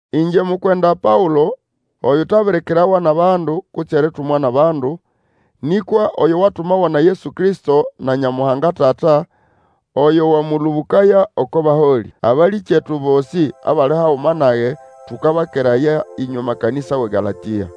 Ingye mukwenda Paũlo, oyutabirikirawa nʼabandu kutse eritumwa nʼabandu, nĩkwa oyo watumawa na Yesu Kristo na Nyamuhanga Tata, oyo wamũlũbũkaya oko baholĩ. Abalĩkyetu bosĩ abali haguma nage tũkabakeraya ĩnywe makanĩsa wʼeGalatĩa.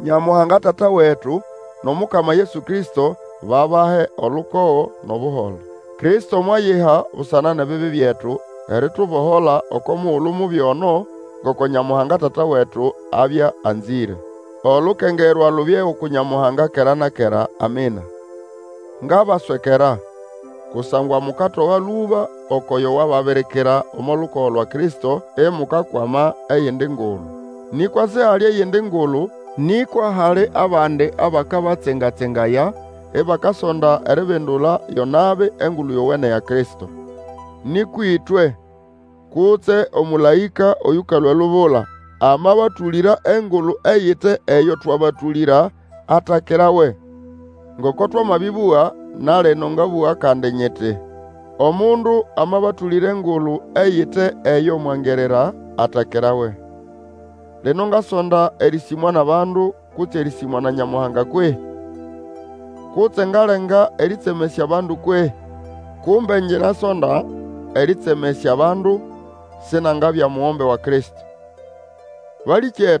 Nyamuhanga Tata wetu, nʼomukama Yesu Kristo, babahe olukogo nʼobuholo. Kristo mwayiha busana nʼebibi byetu eritubohola oko mugulu mubi ono, ngoko Nyamuhanga Tata wetu abya anzĩre. Olukengerwa lubye uku Nyamuhanga kera na kera! Amina. Ngabaswekera! Kusangwa mukatoga lũba ukwʼoyo wababirikira omo lukogo lwa Kristo, imukakwama eyindi ngulu Nĩkwa sihali eyindi Ngulu, nĩkwa hali abandi abakabatsenga-tsengaya, ibakasonda eribindula yo nabi Engulu Yowene ya Kristo. Nĩkwa ĩtwe, kutse omũlaĩka oyũkalũa elubula, amabatũlĩra engulu eyite eyo twabatũlĩra, atakirawe! Ngoko twamabĩbũga, na lino ngabũga kandi nyiti, Omundu amabatũlĩra engulu eyite eyo mwangirira, atakirawe. Lino ngasonda erĩsĩmwa nʼabandu, kutse erĩsĩmwa na Nyamuhanga kwehĩ? Kutse ngalenga erĩtsemesya abandu kwehĩ? Kumbe ngyinasonda erĩtsemesya abandu, sinangabya omugombe wa Kristo. Paũlo mwabirikirwa eribya mukwenda ati?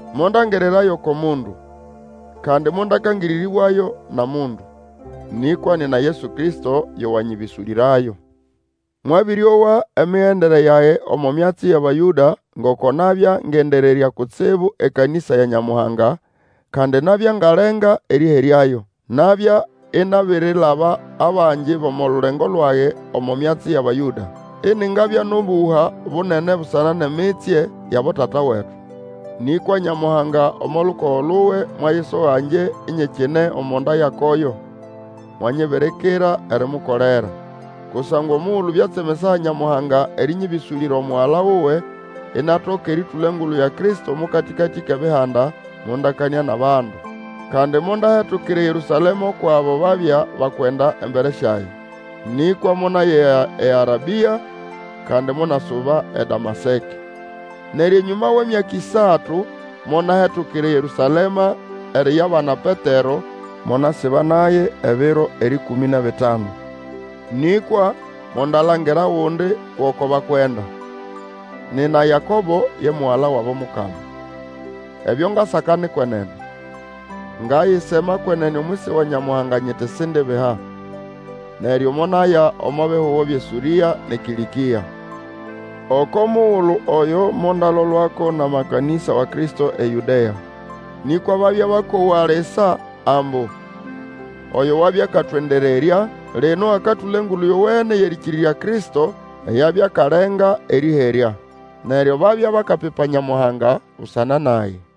Mondangirirayo oko mundu, kandi mondakangĩrĩrĩbwayo na mundu. Nĩkwa nina Yesu Kristo yo wanyĩbĩsũlĩrayo. Mwabĩrĩowa emigendere yage omo myatsi yʼAbayũda, ngoko nabya ngendererya kutsibu ekanĩsa ya Nyamuhanga, kandi nabya ngalenga erĩheryayo. Nabya inabirilaba abangi bʼomo lulengo lwage omo myatsi yʼAbayũda. Iningabya nʼomũhwa munene busana nʼemitsye yʼabotata wetu. Nĩkwa Nyamuhanga, omo lukogo luwe, mwayisoga ngye inyikine omo nda ya koyo, mwanyibirikira erimukolera. Kusangwa omugulu byatsemesaya Nyamuhanga erĩnyĩbĩsũlĩra Omugala wuwe, inatoka erĩtũla Engulu ya Kristo omo katĩkatĩ kʼEbihanda, mondakanĩa nʼabandu. Kandi mondahetukira eYerũsalema ukwʼabo babya bakwenda embere syage. Nĩkwa monaya eArabĩa, kandi monasuba eDamaseke. Neryo enyũma wʼemyaka ĩsatu monahetukira eYerũsalema eriyabana Petero, monasiba naye ebiro erĩkũmĩ nʼebitanu. Nĩkwa mondalangira ogundi gʼoko bakwenda, nina Yakobo, ye mugala wabo Mukama. Ebyo ngasaka ni kwenene. Ngayisema kwenene omwisi wa Nyamuhanga nyiti sindibiha. Neryo monaya omo bihugo byʼeSũrĩa nʼeKĩlĩkĩa. Oko mugulu oyo mondalolwako nʼamakanĩsa wa Kristo eYũdea. Nĩkwa babya bakowa lisa ambu, Oyo wabya akatwendererya, lino akatũla Engulu Yowene yʼerĩkĩrĩrya Kristo, eyo abya akalenga erĩherya. Neryo babya bakapipa Nyamuhanga busana nage.